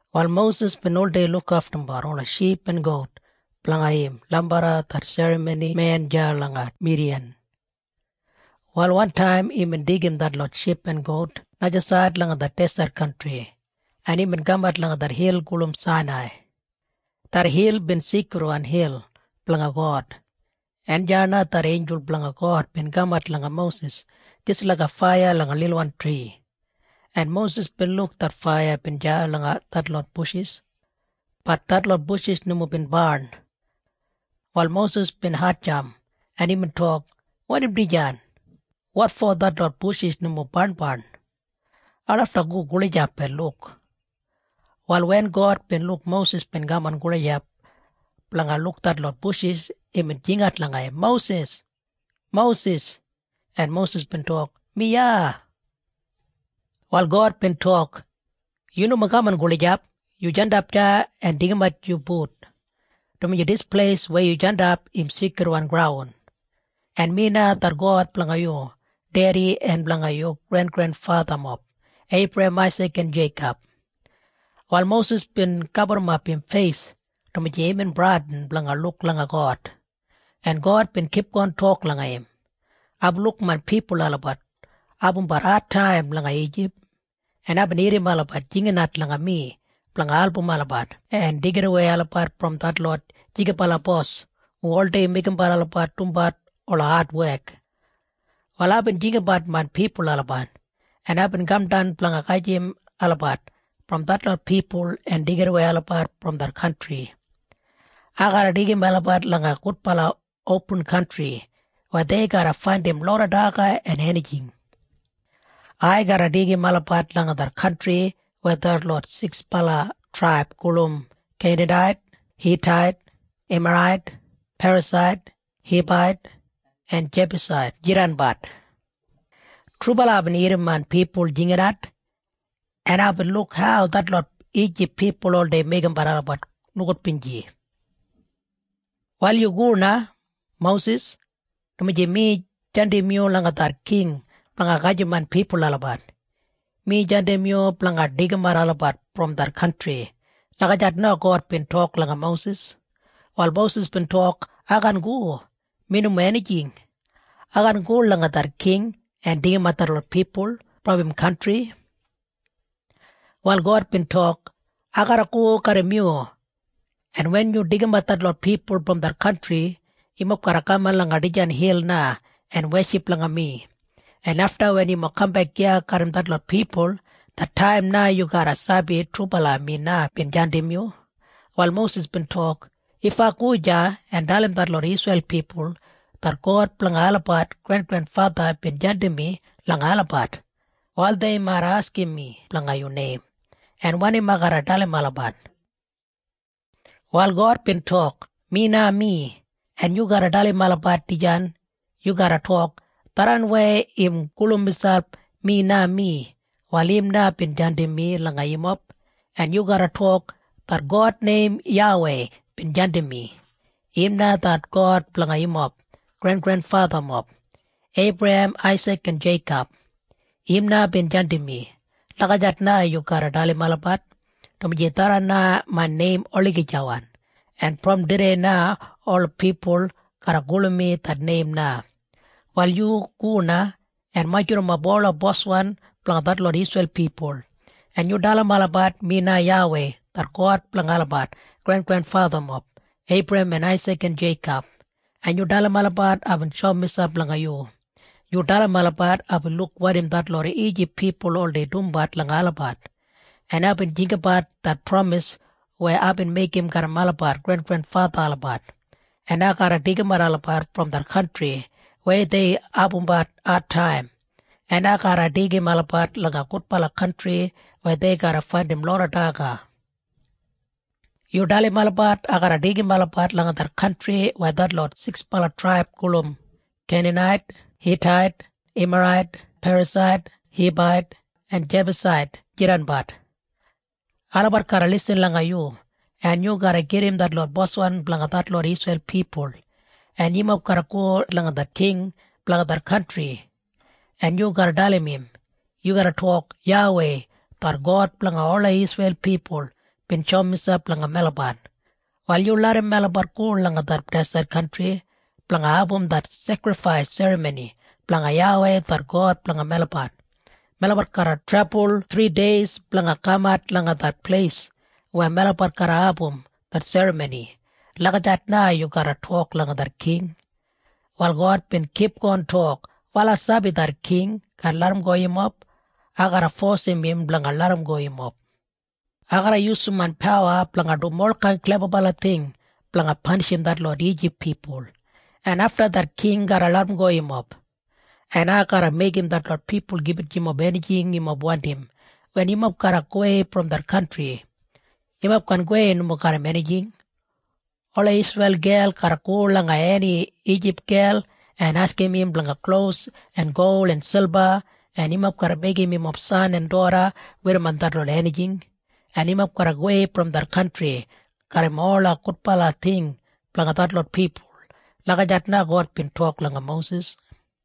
Wal Mosis bin oldei lukaftumbat ola ship en gout blanga im lambarra det serramonimen deya langa Midiyan. Wal wantaim imbin deigim detlot ship en gout najasaid langa det deset kantri, en imbin kamat langa det hil gulum Sainai. Det hil bin seikridwan hil blanga God, en deya na det einjul blanga God bin kamat langa Mosis jis laiga faiya langa lilwan tri, en Mosis bin luk det faiya bin deya langa detlot bushis. Bat detlot bushis nomo bin barn. Wal Mosis bin hatjamp, en imbin tok, “Wanim dijan? Wotfo detlot bushis nomo barnbarn? Ai lafta go gulijap en luk.” Wal wen God bin luk Mosis bin kaman gulijap blanga luk detlot bushis, imbin jingat langa im, “Mosis! Mosis!” En Mosis bin tok, “Mi iya!” Wal God bin tok, “Yu nomo kaman gulijap. Yu jandap deya en deigimat yu but, dumaji dis pleis weya yu jandap im seikridwan graun, en mi na det God blanga yu dedi en blanga yu grengrenfathamob, Eibrahem, Aisik en Jeikob.” Wal Mosis bin gaburrumap im feis, dumaji imbin bradin blanga luk langa God, en God bin kipgon tok langa im, “Aibin luk main pipul olabat abumbat adtaim langa Ijip, en aibin irrim olabat jinginat langa mi blanga album olabat en deigidawei olabat brom detlot jigibala bos hu oldei meigimbat olabat dumbat ola adwek. “Wal aibin jinggabat main pipul olabat, en aibin kamdan blanga gajim olabat brom detlot pipul en deigidawei olabat brom det kantri. Ai garra deigim olabat langa gudbala opin kantri weya dei garra faindim loda daga en enijing. Ai garra deigim olabat langa det kantri weya detlot siksbala traib gulum Keinanait, Hitait, Emarait, Perasait, Hibait en Jebusait jidanbat. Trubala aibin irrim main pipul jinginat, en aibin luk hau detlot Ijip pipul oldei meigimbat olabat nogudbinji. “Wal yu go na, Mosis, dumaji mi jandim yu langa det king blanga gajim main pipul olabat. Mi jandim yu blanga deigimat olabat brom det kantri.” Lagijat na God bin tok langa Mosis. Wal Mosis bin tok, “Ai kaan go! Mi nomo enijing! Ai kaan go langa det king en deigimat detlot pipul brom im kantri!” Wal God bin tok, “Ai garra go garram yu, en wen yu deigimat detlot pipul brom det kantri, yumob garra kaman langa dijan hil na en weship langa mi, en afta wen yu kambek iya garram detlot pipul, det taim na yu garra sabi trubala mi na bin jandim yu.” Wal Mosis bin tok, “If ai go deya en dalim detlot Isreil pipul det God blanga olabat grengrenfatha bin jandim mi langa olabat, wal dei mait askim mi blanga yu neim. En wanim ai garra dalim olabat?” Wal God bin tok, “Mi na mi. En yu garra dalim olabat dijan. Yu garra tok, ‘Tharran weya im gulum miselp Mi na mi, wal im na bin jandim mi langa yumob.’ En yu garra tok, ‘Det God neim YAWEI bin jandim mi. Im na det God blanga yumob grengrenfathamob, Eibrahem, Aisik en Jeikob. Im na bin jandim mi.’ Lagijat na yu garra dalim olabat, dumaji tharran na main neim olagijawan. En brom tudei na ola pipul garra gulum mi det neim na. “Wal yu go na en majurrumap ola boswan blanga detlot Isreil pipul, en yu dalim olabat mi na YAWEI det God blanga olabat grengrenfathamob, Eibrahem en Aisik en Jeikob, en yu dalim olabat aibin shoum miselp langa yu. Yu dalim olabat aibin luk wanim detlot Ijip pipul oldei dumbat langa olabat, en aibin jinggabat det pramis weya aibin meigim garram olabat grengrenfatha olabat, en ai garra deigimat olabat brom det kantri weya dei abumbat adtaim, en ai garra deigim olabat langa gudbala kantri weya dei garra faindim loda daga. Yu dalim olabat ai garra deigim olabat langa det kantri weya detlot siksbala traib gulum Keinanait, Hitait, Emarait, Perasait, Hibait en Jebusait jidanbat. Olabat garra lisin langa yu, en yu garra gedim detlot boswan blanga detlot Isreil pipul, en yumob garra go langa det king blanga det kantri, en yu garra dalim im. Yu garra tok, ‘YAWEI det God blanga ola Isreil pipul bin shoum miselp langa melabat. Wal yu larram melabat go langa det deset kantri blanga abum det sekrifais serramoni blanga YAWEI det God blanga melabat. Melabat garra trebul thrideis blanga kamat langa det pleis weya melabat garra abum det serramoni.’ Lagijat na yu garra tok langa det king.” Wal God bin kipgon tok, “Wal ai sabi det king kaan larramgo yumob. Ai garra fosim im blanga larramgo yumob. Ai garra yusum main pawa blanga dum olkain klebabala ting blanga panishim detlot Ijip pipul, en afta det king garra larramgo yumob, en ai garra meigim detlot pipul gibit yumob enijing yumob wandim wen yumob garra gowei brom det kantri. Yumob kaan gowei nomo garram enijing. Ola Isreil gel garra go langa eni Ijip gel en askim im blanga klos en gol en silba, en yumob garra meigim yumob san en doda werrimon detlot enijing, en yumob garra gowei brom det kantri garram ola gudbala ting blanga detlot pipul.” Lagijat na God bin tok langa Mosis.